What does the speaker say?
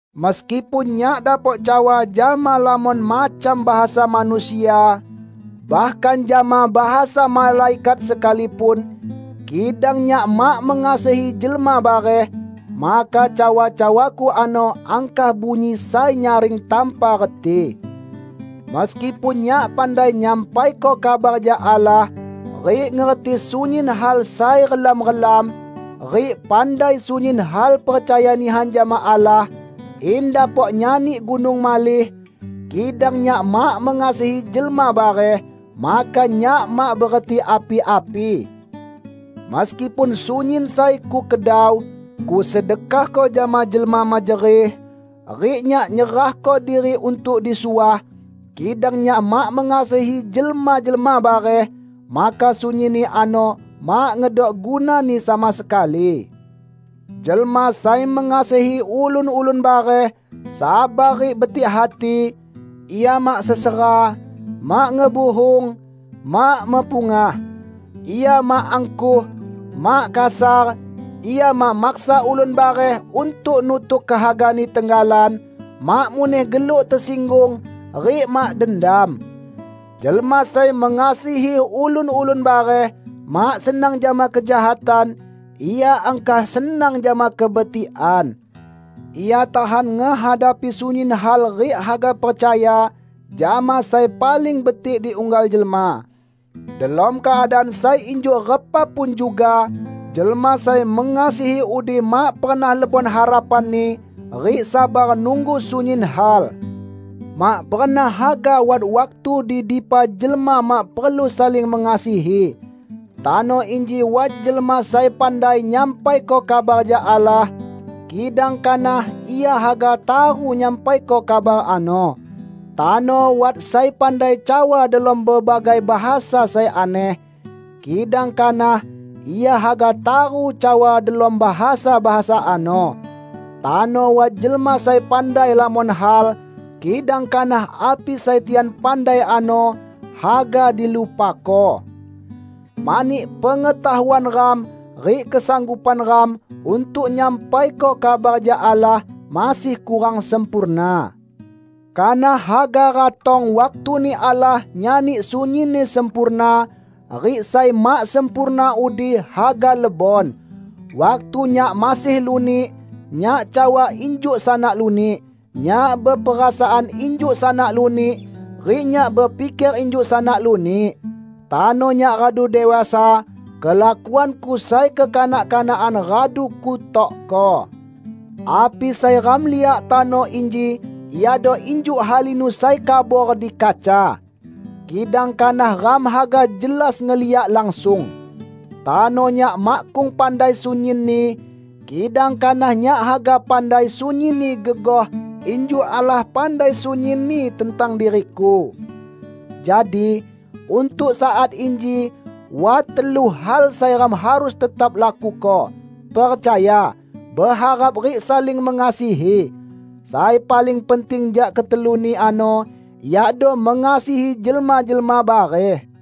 Meskipun nyak dapok cawa jama lamon macam bahasa manusia, bahkan jama bahasa malaikat sekalipun, kidang nyak mak mengasihi jelma bareh, maka cawa-cawaku ano angkah bunyi sai nyaring tanpa reti. Meskipun nyak pandai nyampaiko kabar jak Allah, rik ngerti sunyin hal sai relam-relam, rik pandai sunyin hal percaya nihan jama Allah in dapok nyani gunung malih, kidang nyak mak mengasihi jelma bareh, maka nyak mak bereti api-api! Meskipun sunyin sai kukedau, kusedekahko jama jelma mejerih, rik nyak nyerahko diri untuk disuah, kidang nyak mak mengasihi jelma-jelma bareh, maka sunyinni ano mak ngedok gunani sama sekali. Jelma sai mengasihi ulun-ulun bareh, sabar rik betik hati. Ia mak sesera, mak ngebuhung, mak mepungah. Ia mak angkuh, mak kasar, ia mak maksa ulun bareh untuk nutuk kehagani tenggalan, mak muneh geluk tesinggung, rik mak dendam. Jelma sai mengasihi ulun-ulun bareh, mak senang jama kejahatan, ia angkah senang jama kebetikan. Ia tahan ngehadapi sunyin hal rik haga percaya jama sai paling betik di unggal jelma; delom keadaan sai injuk repa pun juga jelma sai mengasihi udi mak pernah lebon harapanni rik sabar nunggu sunyin hal. Mak pernah haga wat waktu di dipa jelma mak perlu saling mengasihi. Tano inji wat jelma sai pandai nyampaiko kabar jak Allah, kidang kanah ia haga taru nyampaiko kabar ano. Tano wat sai pandai cawa delom bebagai bahasa sai aneh, kidang kanah ia haga taru cawa delom bahasa-bahasa ano. Tano wat jelma sai pandai lamon hal, kidang kanah api sai tian pandai ano haga dilupako. Mani, pengetahuan ram rik kesanggupan ram untuk nyampaiko kabar jak Allah, masih kurang sempurna. Kanah haga ratong waktuni Allah nyani sunyinni sempurna, rik sai mak sempurna udi haga lebon. Waktu nyak masih lunik, nyak cawa injuk sanak lunik, nyak beperasaan injuk sanak lunik rik nyak bepiker injuk sanak lunik. Tano nyak radu dewasa, kelakuanku sai kekanak-kanakan radu kutokko. Api sai ram liak tano inji iado injuk halinu sai kabor di kaca. Kidang kanah ram haga jelas ngeliak langsung. Tano nyak makkung pandai sunyinni, kidang kanah nyak haga pandai sunyinni gegoh injuk Allah pandai sunyinni tentang diriku. Jadi, untuk saat inji wat telu hal sai ram harus tetap lakuko: percaya, beharap rik saling mengasihi. Sai paling penting jak keteluni ano iado mengasihi jelma-jelma bareh.